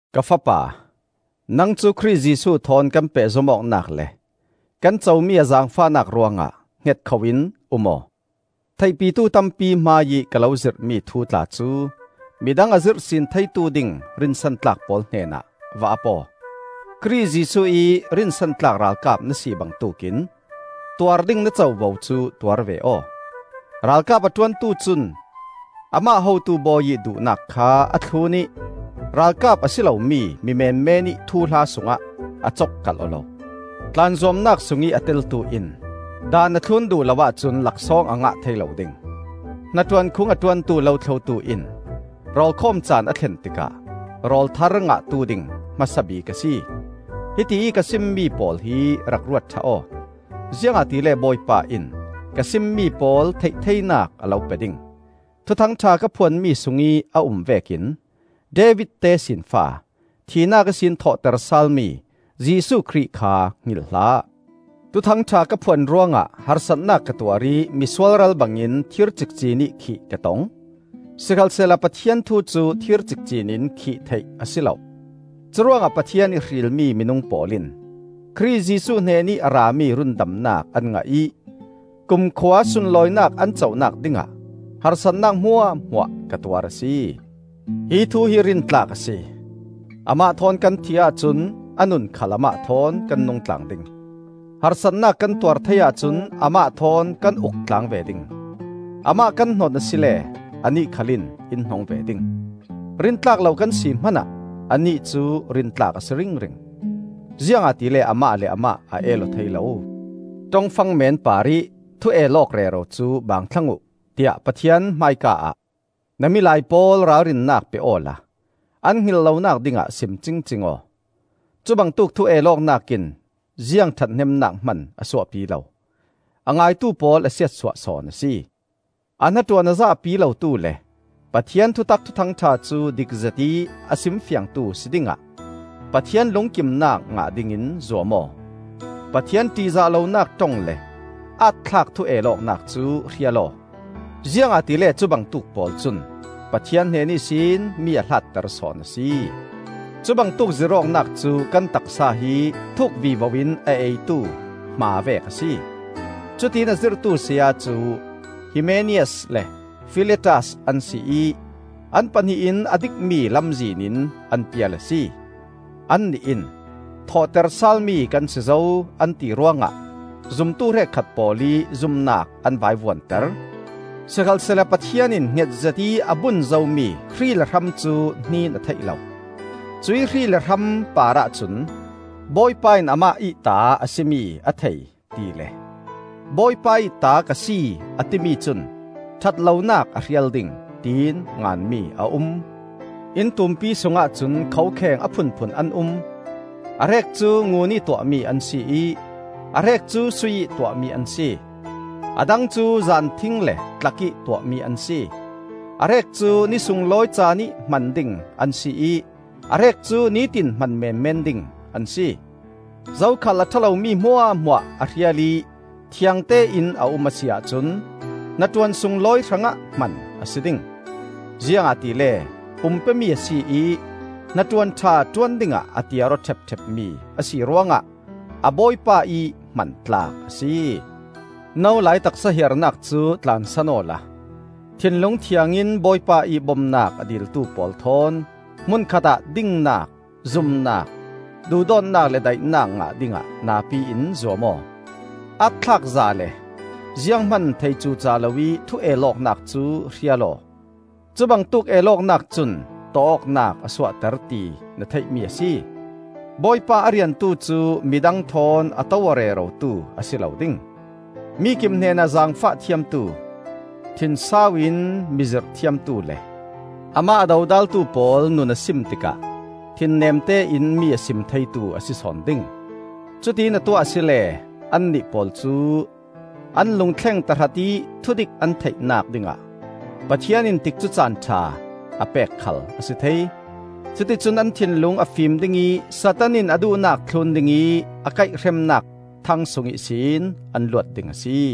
Ka fapa, nang cu Khrih Jesuh thawn kan pehzom awknak le kan comi a zaangfahnak ruangah hngetkhoh-in um aw. Theihpitu tampi hmaiih ka lo zirhmi thu tla cu midang a zirhsin theitu ding rinsantlak pawl hnenah va ap aw. Khrih Jesuh ih rinsantlak ralkap na si bangtuk in tuar ding na covo cu tuar ve aw. Ralkap a ṭuantu cun amah hotu bawi ih duhnak kha a thlun ih ralkap a si lomi mi menmenih thuhla sungah a cokkalh aw lo. Tlan zuamnak sungih a teltu in daan a thlun duh lo ahcun laksawng a ngah thei lo ding. Hnaṭuan khung a ṭuantu lothlotu in rawlkhawm caan a thlen tikah rawl thar ngahtu ding hmasa bik a si. Hitiih ka simmi pawl hi rak ruat ṭha aw; ziangahtile Bawipa in ka simmi pawl theih theinak a lo pe ding. Thuthang ṭha ka phuanmi sungih a um vekin David tesinfa, thihnak ihsin thawhter salmi Jesuh Khrih kha hngilh hlah. Thuthang ṭha ka phuan ruangah harsatnak ka tuar ih misualral bangin thir cikcinih khih ka tong. Sikhalsehla Pathian thu cu thir cikcin in khih theih a si lo. Curuangah Pathian ih hrilmi minung pawl in Khrih Jesuh hnenih a rami rundamnak an ngah ih kumkhua sunlawinak an conak dingah harsatnak hmuahhmuah ka tuar a si. Hi thu hi rintlak a si: “Amah thawn kan thih ahcun, a nun khal amah thawn kan nung tlang ding. Harsatnak kan tuar thei ahcun, amah thawn kan uk tlang ve ding. Amah kan hnon a si le, anih khal in in hnong ve ding. Rintlak lo kan si hmanah, anih cu rintlak a si ringring; Ziangahtile amah le amah a el aw thei lo.” Ṭongfang meen parih thu-el awk rero cu baang thlang uh, tiah Pathian hmaika-ah na milai pawl ralrinnak pe awla an hngilh lonak dingah sim cingcing aw. Cubangtuk thu-el awknak in ziang ṭhathnemnak hman a suahpi lo; a ngaitu pawl a siatsuah sawn a si. A hnaṭuan a zahpi lotu le Pathian thutak Thuthang ṭha cu dik zetih a simfiangtu si dingah Pathian lungkimnak ngah dingin zuam aw. Pathian ṭihzah lonak ṭong le aat-thlak thu-el awknak cu hrial aw. Ziangahtile cubangtuk pawl cun Pathian hnen ihsin mi a hlatter sawn a si. Cubangtuk zirh awknak cu kan taksa hi thuk vivo in a eitu hma vek a si. Cutiin a zirhtu saya cu Himeneas le Filetas an si ih, an pahnih in a dikmi lamzin in an pial a si. Annih in, “Thawhter salmi kan si zo,” an ti ruangah zumtu hrekkhat pawl ih zumnak an vaivuanter. Sikhalsehla Pathian in hngetzet ih a bun zomi hrih le hram cu hnin a theih lo. Cuih hrih le hram parah cun, “Bawipa in amah ih ta a si mi a thei,” tile, “Bawipa ih ta ka si a timi cun ṭhat lonak a hrial ding,” tiin nganmi a um. Inn tumpi sungah cun khokheng a phunphun an um. A hrek cu ngunih tuahmi an si ih a hrek cu sui ih tuahmi an si. A dang cu zanthing le tlak ih tuahmi an si. A hrek cu ni sunglawi caanih hman ding an si ih a hrek cu nitin hman menmen ding an si. Zokhal a ṭha lomi hmuahhmuah a hrial ih thiangte in a um a si ahcun hnaṭuan sunglawi hrangah hman a si ding. Ziangahtile pum pe-mi a si ih hnaṭuan ṭha ṭuan dingah a tiar aw ṭhepṭhep-mi a si ruangah a Bawipa ih hman tlak a si. No lai taksa hiarnak cu tlansan awla thinlung thiangin Bawipa ih bomnak a diltu pawl thawn hmun khatah dingnak, zumnak, duhdawtnak le daihnak ngah dingah napi in zuam aw. Aatthlakza le zianghman thei cuca loih thu-el awknak cu hrial aw. Cubangtuk el awknak cun tawh awknak a suahter ti na theihmi a si. Bawipa a riantu cu midang thawn a to-aw rerotu a si lo ding. Mikip hnenah zaangfah thiamtu, thinsau in mi zirh thiamtu le, amah a dodaltu pawl nun a sim tikah thinnemte in mi a sim theitu a si sawn ding. Cutiin a tuah a si le annih pawl cu an lungthleng tahratih thudik an theihnak dingah Pathian in tikcu caan ṭha a pek khal a si thei. Cuticun an thinlung a fim ding ih Satan in a duhnak thlun ding ih a kaihremnak thang sung ihsin an luat ding a si.